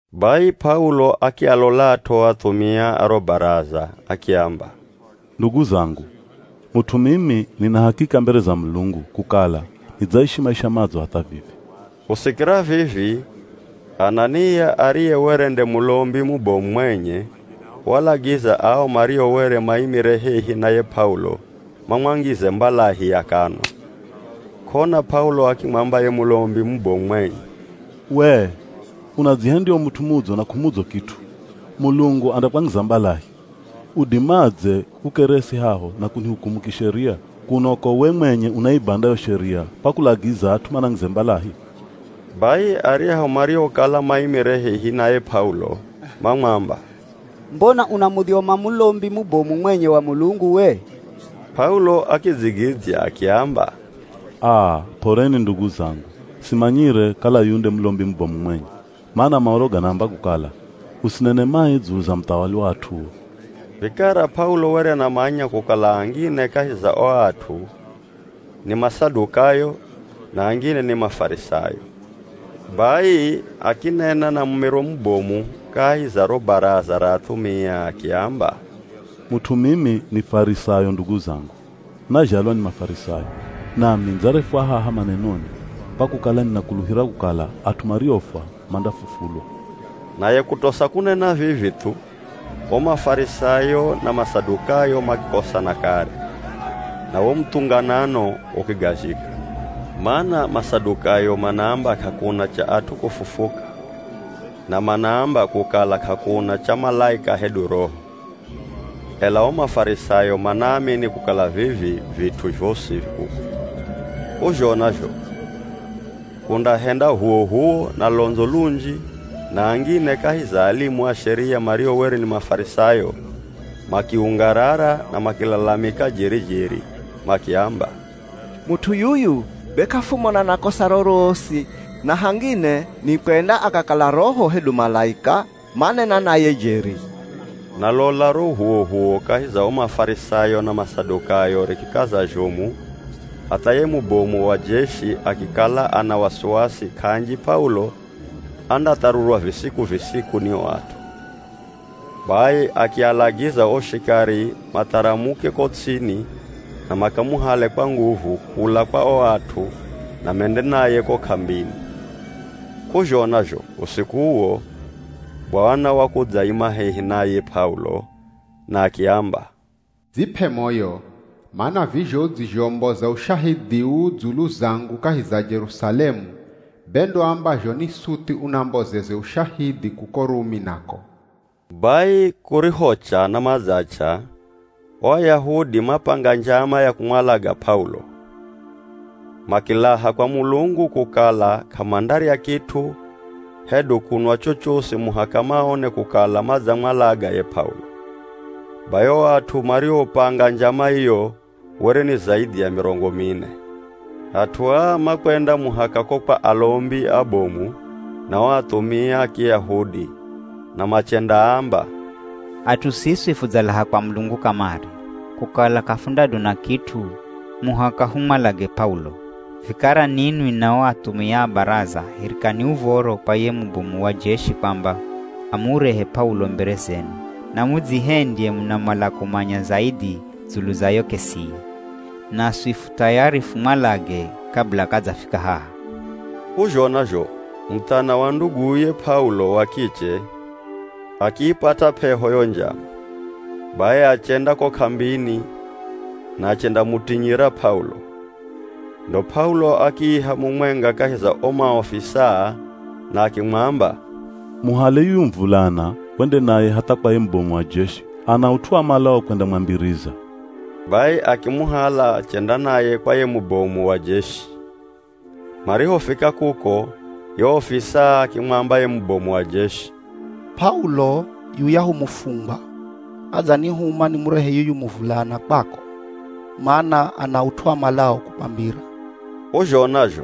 Bai P'aulo akialolat'o o athumia a ro Baraza, akiamba, “Ndugu zangu! Mut'u mimi nina hakika mbere za Mulungu kukala nidzaishi maisha madzo hatha vivi.” Kusikira vivi Anania ariye were nde Mulombi mubomu mwenye, waalagiza ao mario were maimire hehi na ye P'aulo, mamwangize mbalahi ya kanwa. K'ona P'aulo akimwamba ye Mulombi mubomu mwenye, “Wee, unadzihendya u mut'u mudzo na k'umudzo kit'u! Mulungu andakwangiza mbalahi. Udimadze kukeresi haho na kunihukumu kisheria, kuno ko we mwenye unaibanda yo sheria kwa kulagiza at'u manangize mbalahi!” Bai aryahu mariokala maimire hehi na ye P'aulo, mamwamba, “Mbona unamudhyoma Mulombi mubomu mwenye wa Mulungu we?” P'aulo akidzigidzya akiamba, “Aa, p'oreni ndugu zangu, simanyire kala yuyu nde Mulombi mubomu mwenye, mana Maoro ganaamba kukala, ‘Usinene mai dzulu za muthawali wa at'uo.’” Vikara P'aulo were anamanya kukala angine kahi za o at'u ni Masadukayo na angine ni Mafarisayo, bai akinena na mumiro mubomu kahi za ro Baraza ra athumia, akiamba, “Mut'u mimi, ni Farisayo ndugu zangu, nazhalwa ni Mafarisayo. Nami nidzarefwa haha manenoni, kwa kukala ninakuluhira kukala at'u mariofwa mandafufulwa.” Naye kutosa kunena vivi thu, o Mafarisayo na Masadukayo makikosana kare, na wo muthunganano ukigazhika. (Mana Masadukayo manaamba k'akuna cha at'u kufufuka na manaamba kukala k'akuna cha malaika hedu roho, ela o Mafarisayo manaamini kukala vivi vit'u zhosi vi kuko.) K'uzhona zho kundahenda h'uwoh'uwo na londzo lunji na angine kahi za alimu a Sheria mario were ni Mafarisayo makiungarara na makilalamika jeri-jeri makiamba, “Mut'u yuyu be k'afumona na kosa rorosi na hangine nikwenda akakala roho hedu malaika manena naye jeri!” Na lola ro h'uwoh'uwo kahi za o Mafarisayo na Masadukayo rikikaza zhomu hatha ye mubomu wa jeshi akikala ana wasiwasi k'anji P'aulo andatharurwa visiku-visiku ni ao at'u. Bai akialagiza o shikari matharamuke ko ts'ini na makamuhale kwa nguvu kula kwa o at'u na mende naye ko k'ambini. K'uzhona zho, usiku uwo, Bwana wakudzaima hehi na ye P'aulo na akiamba, “Dzip'e moyo, mana vizho udzizhomboza ushahidhi uu dzulu zangu kahi za Jerusalemu, be ndo ambazho ni suthi unambozeze ushahidhi kuko Rumi nako.” Bai kurihocha na madzach'a o Ayahudi mapanga njama ya kumwalaga P'aulo, makilaha kwa Mulungu kukala k'amandarya kit'u hedu kunwa chochosi muhaka maone kukala madzamwalaga ye P'aulo. Bai o at'u mariopanga njama iyo were ni zaidhi ya mirongo mine. At'u aa makwenda muhaka ko kwa alombi abomu na o athumia a Kiyahudi na machendaamba, “At'u siswi fudzalaha kwa Mulungu kamare, kukala k'afundadona kit'u muhaka humwalage P'aulo. Vikara ninwi na o athumia a Baraza hirikani uv̱oro kwa ye mubomu wa jeshi kwamba amurehe P'aulo mbere zenu na mudzihendye munamala kumanya zaidhi dzulu za yo k'esiye, naswi fu thayari fumwalage kabila k'adzafika haha.” K'uzhona zho muthana wa nduguye P'aulo wa kiche akiipata p'eho yo njama, bai achenda ko k'ambini na achendamutinyira P'aulo. Ndo P'aulo akiiha mumwenga kahi za o maofisaa na akimwamba, “Muhale yuyu muvulana wende naye hatha kwa ye mubomu wa jeshi, ana ut'u amalao kwendamwambiriza.” Bai akimuhala achenda naye kwa ye mubomu wa jeshi. Marihofika kuko ye ofisaa akimwamba ye mubomu wa jeshi, “P'aulo, yuyahu mufungwa adzanihuma nimurehe yuyu muvulana kwako, mana ana ut'u amalao kukwambira.” K'uzhona zho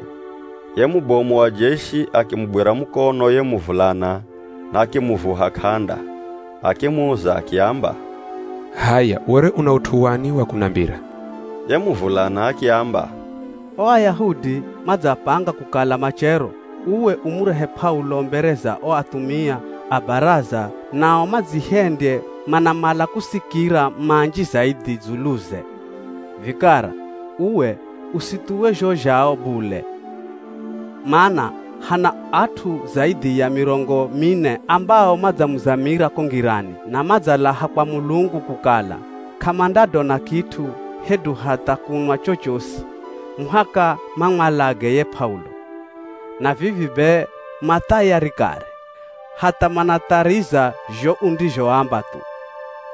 ye mubomu wa jeshi akimugwira mukono ye muvulana na akimuvuha k'anda, akimuza akiamba, “H'aya were una ut'u wani wa kunambira?” Ye muvulana akiamba, “O Ayahudi madzapanga kukala machero, uwe umurehe P'aulo mbere za o athumia a Baraza nao madzihendye manamala kusikira manji zaidhi dzuluze. Vikara uwe, usithuwe zho zhao bule, mana hana at'u zaidhi ya mirongo mine ambao madzamuzamira ko ngirani na madzalaha kwa Mulungu kukala k'amandadona kit'u hedu hatha kunwa chochosi muhaka mamwalage ye P'aulo. Na vivi be ma thayari kare, hatha manathariza zho undizhoamba thu.”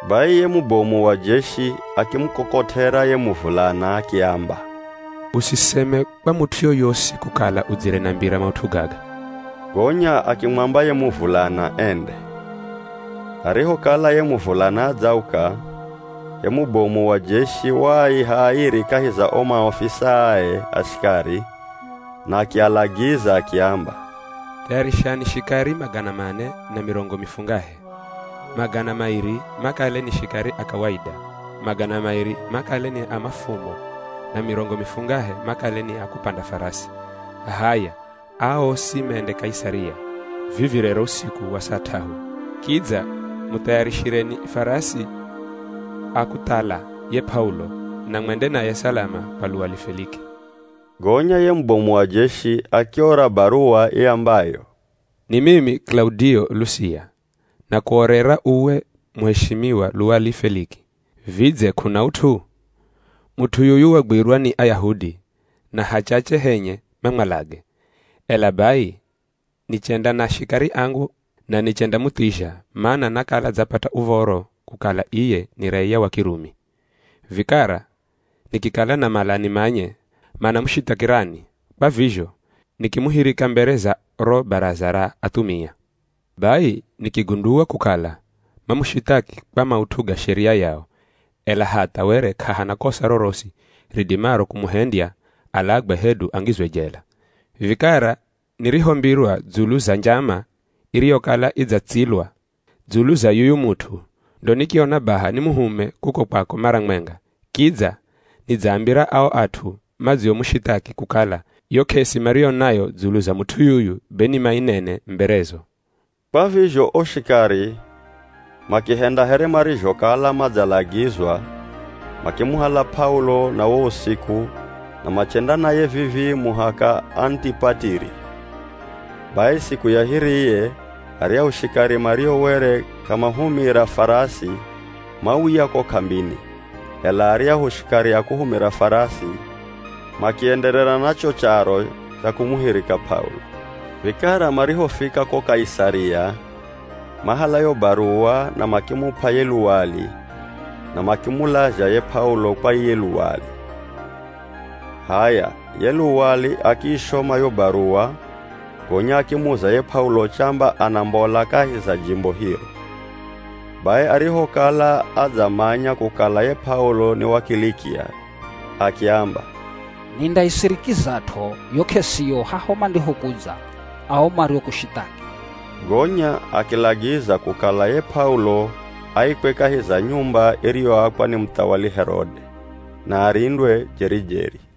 Bai ye mubomu wa jeshi akimukokot'era ye muvulana akiamba, “Usiseme kwa mut'u yoyosi kukala udzire nambira maut'u gaga.” Gonya akimwamba ye muvulana ende. Arihokala ye muvulana adzauka, ye mubomu wa jeshi waaiha airi kahi za o maofisaae a shikari na akialagiza akiamba, “Thayarishani shikari magana mane na mirongo mifungahe. Magana mairi makale ni shikari a kawaida, magana mairi makale ni a mafumo na mirongo mifungahe makale ni a kupanda farasi. H'aya, aa osi mende Kaisaria vivi rero usiku wa saa t'ahu. Kidza muthayarishireni farasi a kuthala ye P'aulo na mwende naye salama kwa luwali Feliki.” Gonya ye mubomu wa jeshi akiora baruwa iambayo: “Ni mimi Kilaudio Lusia, nakuorera uwe muheshimiwa luwali Feliki. Vidze k'una ut'u? Mut'u yuyu wagwirwa ni Ayahudi na hachache henye mamwalage, ela bai nichenda na shikari angu na nichendamuthizha, mana nakala dzapata uv̱oro kukala iye ni raiya wa Kirumi. Vikara nikikala namala nimanye manamushithakirani, kwa vizho nikimuhirika mbere za ro Baraza ra athumia. Bai nikigundua kukala mamushithaki kwa maut'u ga Sheria yao, ela hatha were k'ahana kosa rorosi ridimaro kumuhendya alagwe hedu angizwe jela. Vikara nirihombirwa dzulu za njama iriyokala idzatsilwa dzulu za yuyu mut'u, ndo nikiona baha nimuhume kuko kwako mara mwenga, kidza nidzaambira ao at'u madziomushithaki kukala yo k'esi mariyo nayo dzulu za mut'u yuyu be ni mainene mberezo.” Kwa vizho o shikari, makihenda here marizhokala madzalagizwa, makimuhala P'aulo na wo usiku na machenda naye vivii muhaka Anitipatiri. Bai siku ya hiriye aryahu shikari mario were k'amahumira farasi mauya ko k'ambini, ela aryahu shikari a kuhumira farasi makienderera na cho charo cha kumuhirika P'aulo. Vikara marihofika ko Kaisaria mahala yo baruwa na makimup'a ye luwali na makimulazha ye P'aulo kwa iye luwali. H'aya, ye luwali akiishoma yo baruwa gonya akimuza ye P'aulo chamba anambola kahi za jimbo hiro. Bai arihokala adzamanya kukala ye P'aulo ni wa Kilikia, akiamba, “Nindaisirikizat'o yo k'esiyo haho mandihokudza ao mariokushithaki.” Gonya akilagiza kukala ye P'aulo aikwe kahi za nyumba iriyoakwa ni muthawali Herode, na arindwe jeri-jeri.